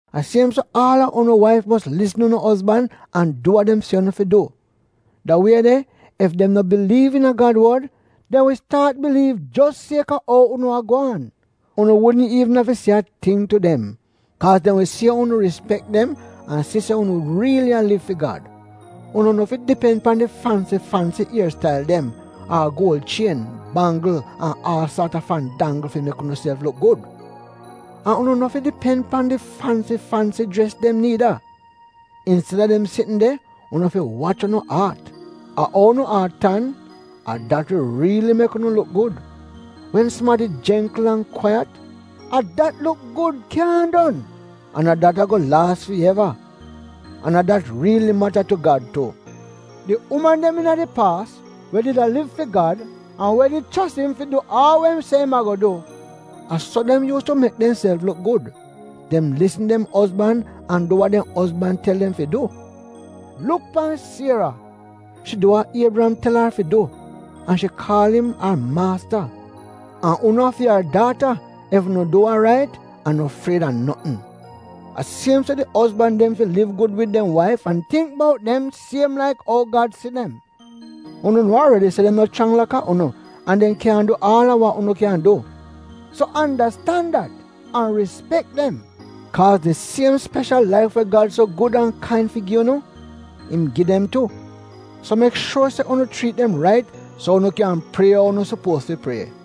A siem so aal a unu waif mos lisn unu ozban an du wa dem se unu fi du. Da wie de ef dem no biliiv iina Gad wod dem wi staat biliiv jos kaaz a ou unu a gwaan. Unu wudn iivn afi se a ting tu dem. Kaaz dem wi si ou unu rispek dem an si se unu riili a liv fi Gad. Unu no fi dipen pan di fansi-fansi ier stail dem, ar guol chien, banggl an aal saat a fandanggl fi mek unuself luk gud. An unu no fi dipen pan di fansi-fansi jres dem niida. Insteda dem sitn de, unu fi wach unu aat. A ou unu aat tan — a dat wi riili mek unu luk gud. Wen sumadi jengkl an kwaiyat — a dat luk gud kyaahn don, an a dat ago laas fi eva, an a dat riili mata tu Gad tu. Di uman dem iina di paas, we did a liv fi Gad an we did chos im fi du aal we im se im ago du — a so dem yuus tu mek demself luk gud. Dem lisn dem ozban an du wa dem ozban tel dem fi du. Luk pan Siera. Shi du wa Iebriyam tel ar fi du, an shi kaal im ar maasta. An unu a fi ar daata ef unu du wa rait an no fried a notn. A siem so di ozban dem fi liv gud wid dem waif an tingk bout dem siem laik ou Gad si dem. Unu nuo aredi se dem no chrang laka unu an dem kyaahn go du aal a wa unu kyan du. So andastan dat an rispek dem, kaaz di siem speshal laif we Gad so gud an kain fi gi unu, im gi dem tu. So mek shuor se unu chriit dem rait so unu kyan prie ou unu sopuoz fi prie.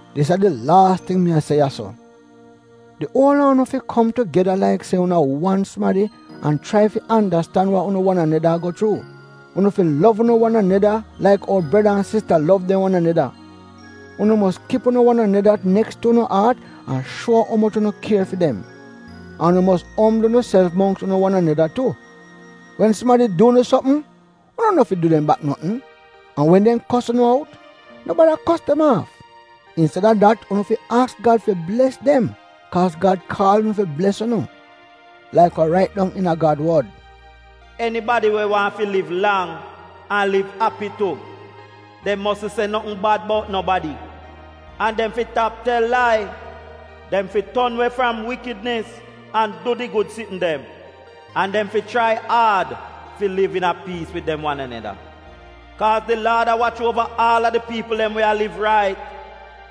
Dis a di laas ting mi a se ya-so. Di uol a unu fi kom tugeda laik se unu a wan sumadi an chrai fi andastan wa unu wan aneda a go chuu. Unu fi lov unu wan aneda laik ou breda an sista lov dem wan aneda. Unu mos kip unu wan aneda neks tu unu aat an shuo umoch unu kier fi dem. An unu mos ombl unuself mongks unu wan aneda tu. Wen sumadi du unu sopm, unu no fi du dem bak notn. An wen dem kos unu out, no bada kos dem aaf; insteda dat unu fi aks Gad fi bles dem kaaz Gad kaal unu fi bles unu. Laik we rait dong iina Gad wod, “Enibadi we waahn fi liv fi lang an liv api tu, dem mosn se notn bad bout nobadi, an dem fi tap tel lai. Dem fi ton we fram wikidnis an du di gud sitn dem. An dem fi chrai aad fi liv iina piis wid dem wan aneda. Kaaz di Laad a wach uova aal a di piipl dem we a liv rait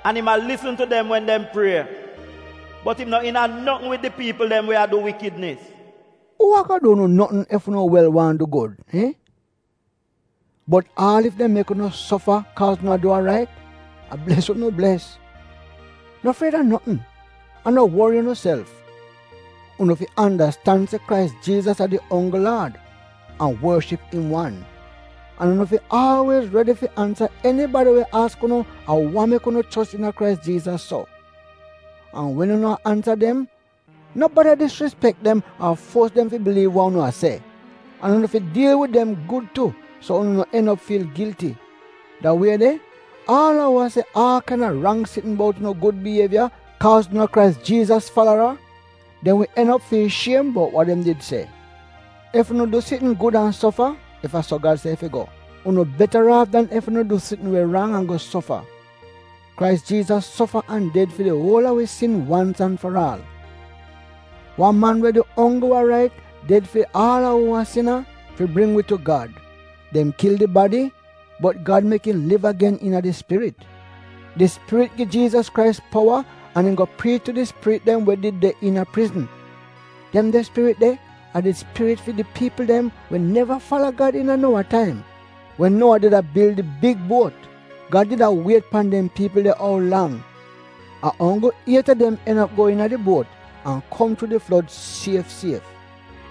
an im a lisn tu dem wen dem prie, bot im no iina notn wid di piipl dem we a du wikidnis.” Uu ago du unu notn ef unu wel waahn du wa gud? Iihn? Bot aal ef dem mek unu sofa kaaz unu a du wa rait — a bles unu bles! No fried a notn, an no wori unuself. Unu fi andastan se Krais Jiizas a di onggl Laad, an worship im wan. An unu fi aalwiez redi fi ansa enibadi we aks unu a wa mek unu chos iina Krais Jiizas so. An wen unu a ansa dem no bada disrispek dem ar fuos dem fi biliiv wa unu a se. An unu fi diil wid dem gud tu, so unu no en op fiil gilti. Da wie de, aal a uu se aal kaina rang sitn bout unu gud bievya kaaz unu a Krais Jiizas falara, dem wi en op fiil shiem bout wa dem did se. Ef unu du sitn gud an sofa — ef a so Gad se it fi go — unu betaraaf dan ef unu du sitn we rang an go sofa. Kaaz Krais Jiizas sofa an ded fi di uol a wi sin wans an faraal. Wan man we du onggl wa rait, ded fi aal a uu a sina, fi bring wi tu Gad. Dem kil di badi, bot Gad mek im liv agen iina di Spirit. Di Spirit gi Jiizas Krais powa an im go priich tu di spirit dem we did de iina prizn. Dem de spirit de, a di spirit fi di piipl dem we neva fala Gad iina Nowa taim, wen Nowa did a bil di big buot. Gad did a wiet pan dem piipl de ou lang. A onggl iet a dem en op go iina di buot an kom chuu di flod sief sief.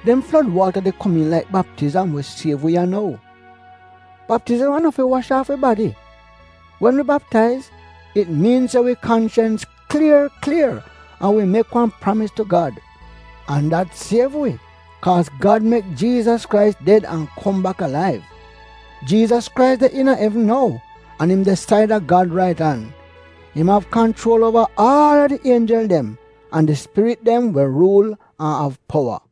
Dem flod waata de komiin laik baptizam we siev wi ya nou. Baptizam a no fi wash aaf wi badi. Wen wi baptaiz, it miin se wi kanchens klier klier an wi mek wan pramis tu Gad. An dat siev wi kaaz Gad mek Jiizas Krais ded an kom bak alaiv. Jiizas Krais de iina evn nou an im de saida Gad rait an. Im av kanchuol uova aal a di ienjel dem, an di spirit dem we ruul an av powa.